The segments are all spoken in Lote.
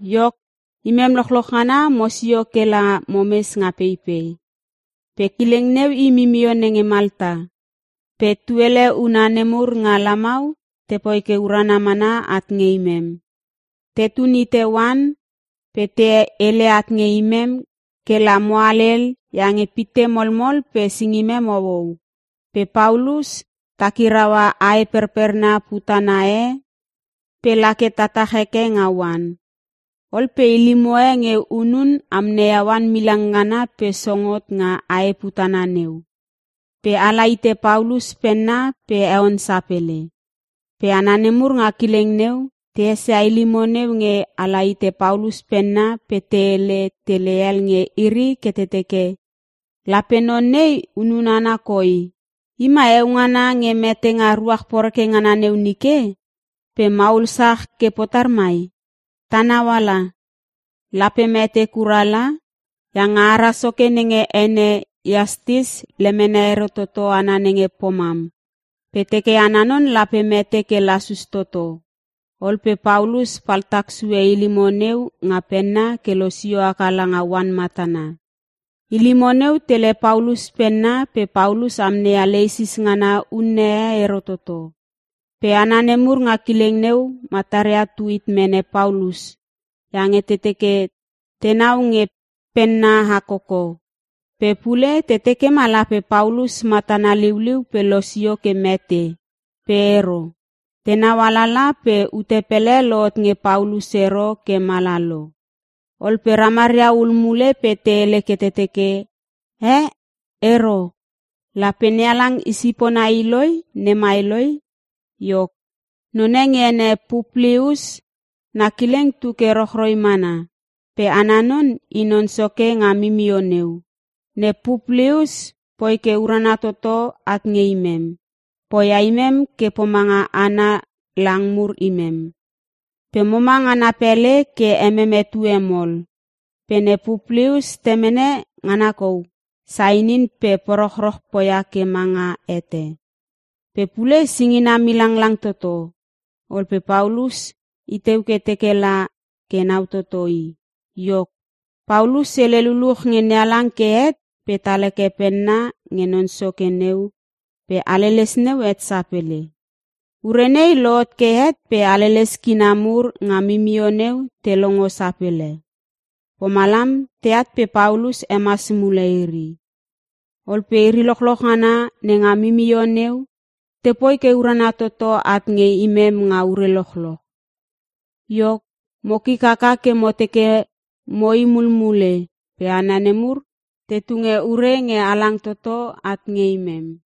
Iok, imem lochloch ngana mosio ke la momes nga peipei, pe kileng neu i mimio nenge Malta. Pe tuele huna nemur nga lamau tepoi ke urana mana at nge imem. Tetun hite oan pe te hele at nge imem ke la mo halel iange pitte molmol pe singimem houhou. Pe Paulus takiraua ae perperna putana e pe lake tatach heke nga oan. Ol pe ilimo e nge hunun amneia oan milang ngana pe song hot nga ae putana neu, pe ala hite Paulus penna pe heon sapele. Pe hana nemur nga kileng neu, te esia ilimo neu nge ala hite Paulus penna pe te hele tele hel nge iri ke te teke, “Lape non nei hunun hana koi! I mai heo ngana nge mete nga ruach poreke ngana neu nike, pe maul sach ke potar mai? Ta nauala. Lape mete kura la iange ara soke nenge ene Iastis lemene ero toto hana nenge pomam pe teke ana non lape mete ke lasus toto.” Ol pe Paulus paltak sue ilimo neu nga penna ke losio haka langa oan matana. Ilimo neu tele Paulus penna pe Paulus amneia leisis ngana unne e ero toto. Pe hana nemur nga kileng neu, mataria tu hit mene Paulus iange te teke tenau nge penna hakoko. Pe pule te teke ma lape Paulus matana liuliu pe losio ke mete, pe ero. Tenau alala pe ute pele lohot nge Paulus ero ke mala lo. Ol pe ramaria hul mule pe te hele ke te teke, “Eh, ero. Lape NeHalang i sipona iloi nemai loi!” Iok, none nge ene Puplius, na kileng tu ke rochroi mana. Pe ana non, i non soke nga mimio neu. Ne Puplius poi ke urana toto at nge imem. Poia imem ke pomanga ana lang mur imem, pe moma nga na pele ke emem etue mol. Pe ne Puplius temene ngana kou sainin pe porochroch poia ke manga hete. Pe pule singina milanglang toto. Ol pe Paulus i teu ke teke la ke nau toto i. Iok, Paulus hele luluch nge NeHalang ke het pe tal heke penna nge non soke neu pe haleles neu het sapele. Ure nei lohot ke het pe haleles kina mur nga mimio neu te longo sapele. Pomalam teat pe Paulus hemas mule iri. Ol pe iri lochloch ngana nenga mimio neu tepoi ke urana toto at nge imem nga ure lochloch. Iok mo kik haka ke mo teke mo i mulmule pe hana nemur te tunge ure nge halang toto at nge imem.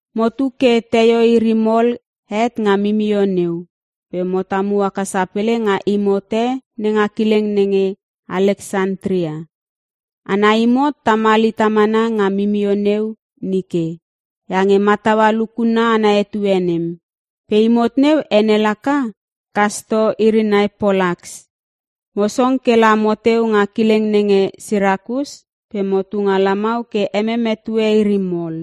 Motu ke teio iri mol het nga mimio neu pe mo tamu haka sapele nga imot e nenga kileng nenge Aleksantria. Ana imot tamal hita mana nga mimio neu nike iange mataua lukunna ana etue nem. Pe imot neu ene laka “Kasto Irinai Polaks.” Mo song ke la moteu nga kileng nenge Sirakus pe motu nga lamau ke emem etue iri mol.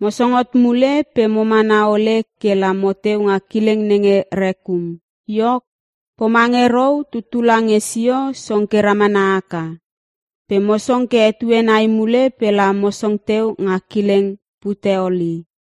Mo song hot mule pe mo mana ole ke la moteu nga kileng nenge Rekium. Iok, pomange rou tuttula nge sio song ke ramana haka. Pe mo song ke etue nai mule pe la mo song teu nga kileng Puteoli.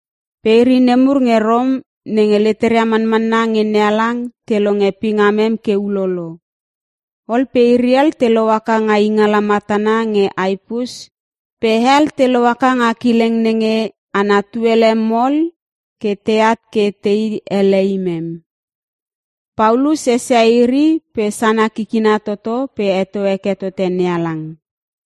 Pe iri nemur nge Rom nenge leteria manmanna nge NeHalang te longe pingamem ke ulolo. Ol pe iri hel te lohaka nga ingala matana nge Apius pe hel te lohaka nga kileng nenge ana Tuele Mol ke teat ke tei ele imem. Paulus esia iri pe sana kikina toto pe heto heke tote NeHalang.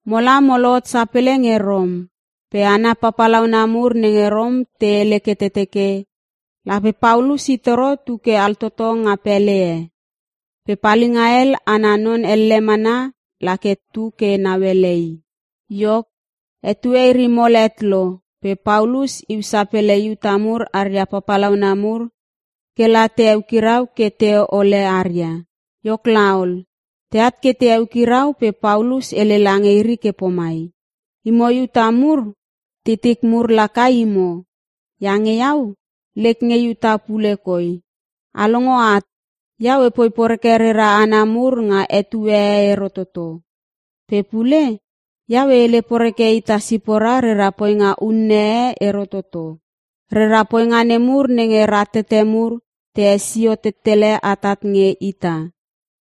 Mola mo lohot sapele nge Rom. Pe hana papalauna mur nenge Rom te hele ke te teke lape Paulus i toro tu ke altoto nga pele e. Pe palinga hel ana non elle mana la ke tu ke nauele i. Iok, etue iri mol het lo pe Paulus iu sapele Iuta mur aria papalauna mur ke la te eukirau ke te hole aria. Iok laol, teat ke te eukirau pe Paulus hele lange iri ke pomai, “Imo Iuta mur titik mur laka imo. Iange iau, lek nge Iuta pule koi. A longo at, iau epoi poreke rera hana mur nga etue e ero toto. Pe pule, iau e hele poreke ita sipora rera poinga unne e ero toto. Rera poinga nemur nenge ratete mur te hesio tettele atat nge ita.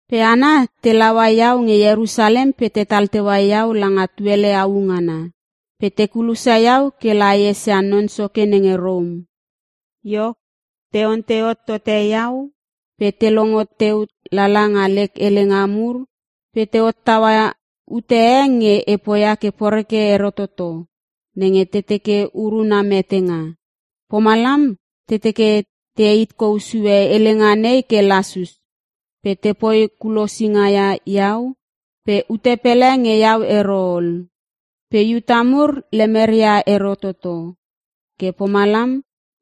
Pe hana te laua iau nge Ierusalem pe tetal teua iau langa tuele au ngana. Pe te kulosia iau ke la e esia non soke nenge Rom. Iok, te ontei hot tote iau pe te longo teu lala nga lek helenga mur pe te hottaua ute e nge e poia ke poreke ero toto nenge te teke uruna metenga. Pomalam te teke te heit kou sue helenga nei ke lasus pe tepoi kulosinga ia iau pe ute pele nge iau ero ol. Pe Iuta mur lemeria ero toto. Ke pomalam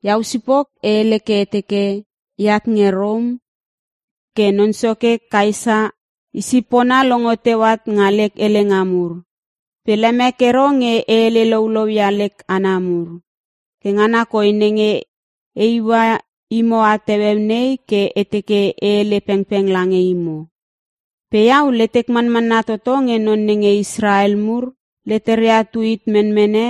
iau sipok e hele ke e teke eat nge Rom ke non soke Kaesa i sipona longo teu at nga lek helenga mur. Pe lemek ero nge e hele loulou ia lek hana mur. Ke ngana koi nenge e iua imo at heueu nei ke e teke e hele pengpeng lange imo. Pe iau letek manmanna toto nge non nenge Israel mur leteria tu hit menmene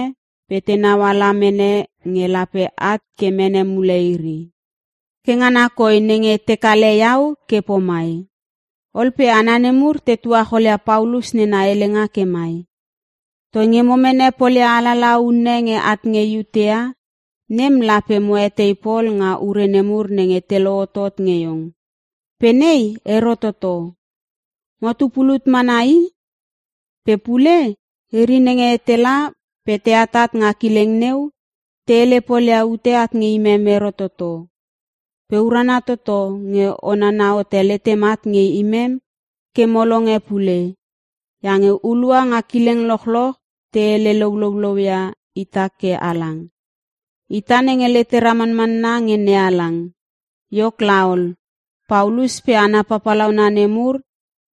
pe tenau ala mene nge lape at ke mene mule iri. Ke ngana koi nenge te kale iau ke pomai.” Ol pe hana nemur te tuacholia Paulus nena helenga ke mai, “Toinge mo mene polia alalaha unne nge at nge Iutea, nem lape mo etei pol nga ure nemur nenge te lohotot nge iong. Pe nei ero toto. Motu pulut mana i. Pe pule, iri nenge tela pe te atat nga kileng neu, te hele polia ute at nge imem ero toto. Pe urana toto nge o nana hote letem at nge imem ke mo longe pule iange hulua nga kileng lochloch te hele loulouia ita ke halang. Ita nenge letera manmanna nge NeHalang.” Iok laol, Paulus pe hana papalauna nemur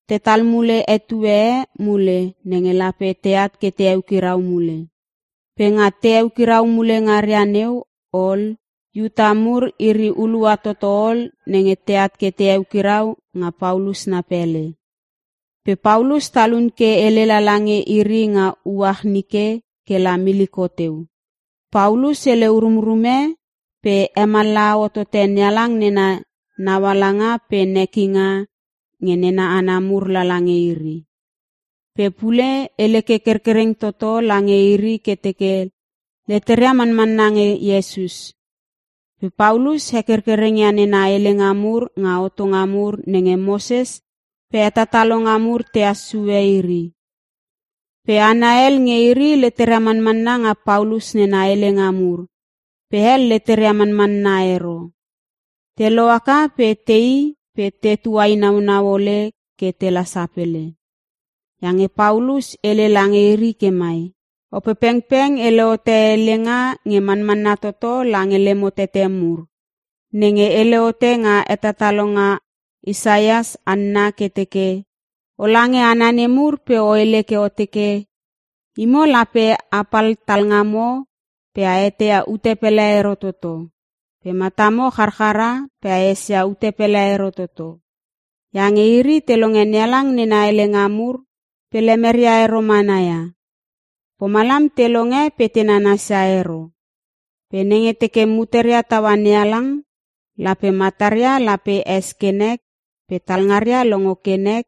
tetal mule etue e mule nenge lape teat ke te eukirau mule. Pe nga te eukirau mule ngaria neu ol, Iuta mur iri hulua toto ol nenge teat ke te eukirau nga Paulus na pele. Pe Paulus talun ke hele lala nge iri nga uach nike ke la miliko teu. Paulus hele urumrume pe hemallaha hotote NeHalang nena naualanga pe nekinga nge nena hana mur lala nge iri. Pe pule hele ke kerkereng toto lange iri ke teke leteria manmanna nge Iesus. Pe Paulus hekerkereng ia nena helenga mur nga hotonga mur nenge Moses pe hetatalonga mur tehas sue iri. Pe hana hel nge iri leteria manmanna nga Paulus nena helenga mur pe hel leteria manmanna ero. Te lohaka pe tei pe te tuainaunau ole ke tela sapele. Iange Paulus hele lange iri ke mai, “Opepengpeng hele hote helenga nge manmanna toto lange lemo tete mur, nenge hele hote nga hetatalonga Isaias hanna ke teke, “‘O lange hana nemur pe o hele ke o teke: “Imo lape a pal talngamo pe a eteia ute pele ero toto. Pe matamo charchara pe a esia ute pele ero toto. Iange iri te longe NeHalang nena helenga mur pe lemeria ero mana ia. Pomalam te longe pe te nanasia ero. Pe nenge teke muteria taua NeHalang, lape mataria lape es ke nek pe talngaria longo ke nek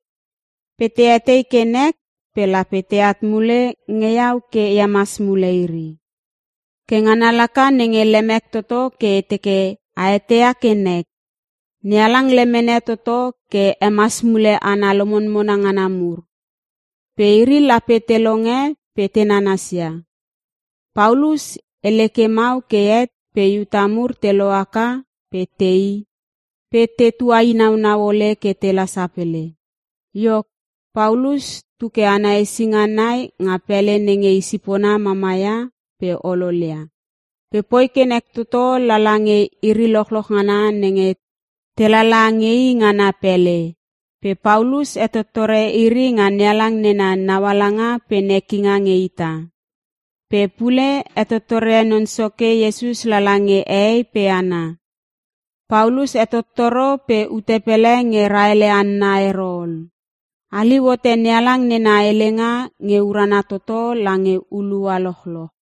pe te etei ke nek pe lape teat mule nge iau ke e hemas mule iri.’ “Ke ngana laka nenge lemek toto ke e teke a eteia ke nek. NeHalang lemene toto ke hemas mule hana lomonmona ngana mur. Pe iri lape te longe pe te nanasia!” [ Paulus hele ke mau ke het pe Iuta mur te lohaka pe tei pe te tuainaunau ole ke tela sapele.] Iok, Paulus tu ke ana hesinga nai nga pele nenge i sipona mamaia pe ololia. Pe poi ke nek toto lala nge iri lochloch ngana nenge te lala nge i nga na pele. Pe Paulus hetottore iri nga NeHalang nena naualanga pe nekinga nge ita. Pe pule hetottore Non Soke Iesus lala nge hehei pe hana. Paulus hetottoro pe ute pele nge raele hanna ero ol. Haliu hote NeHalang nena helenga nge urana toto lange hulua lochloch.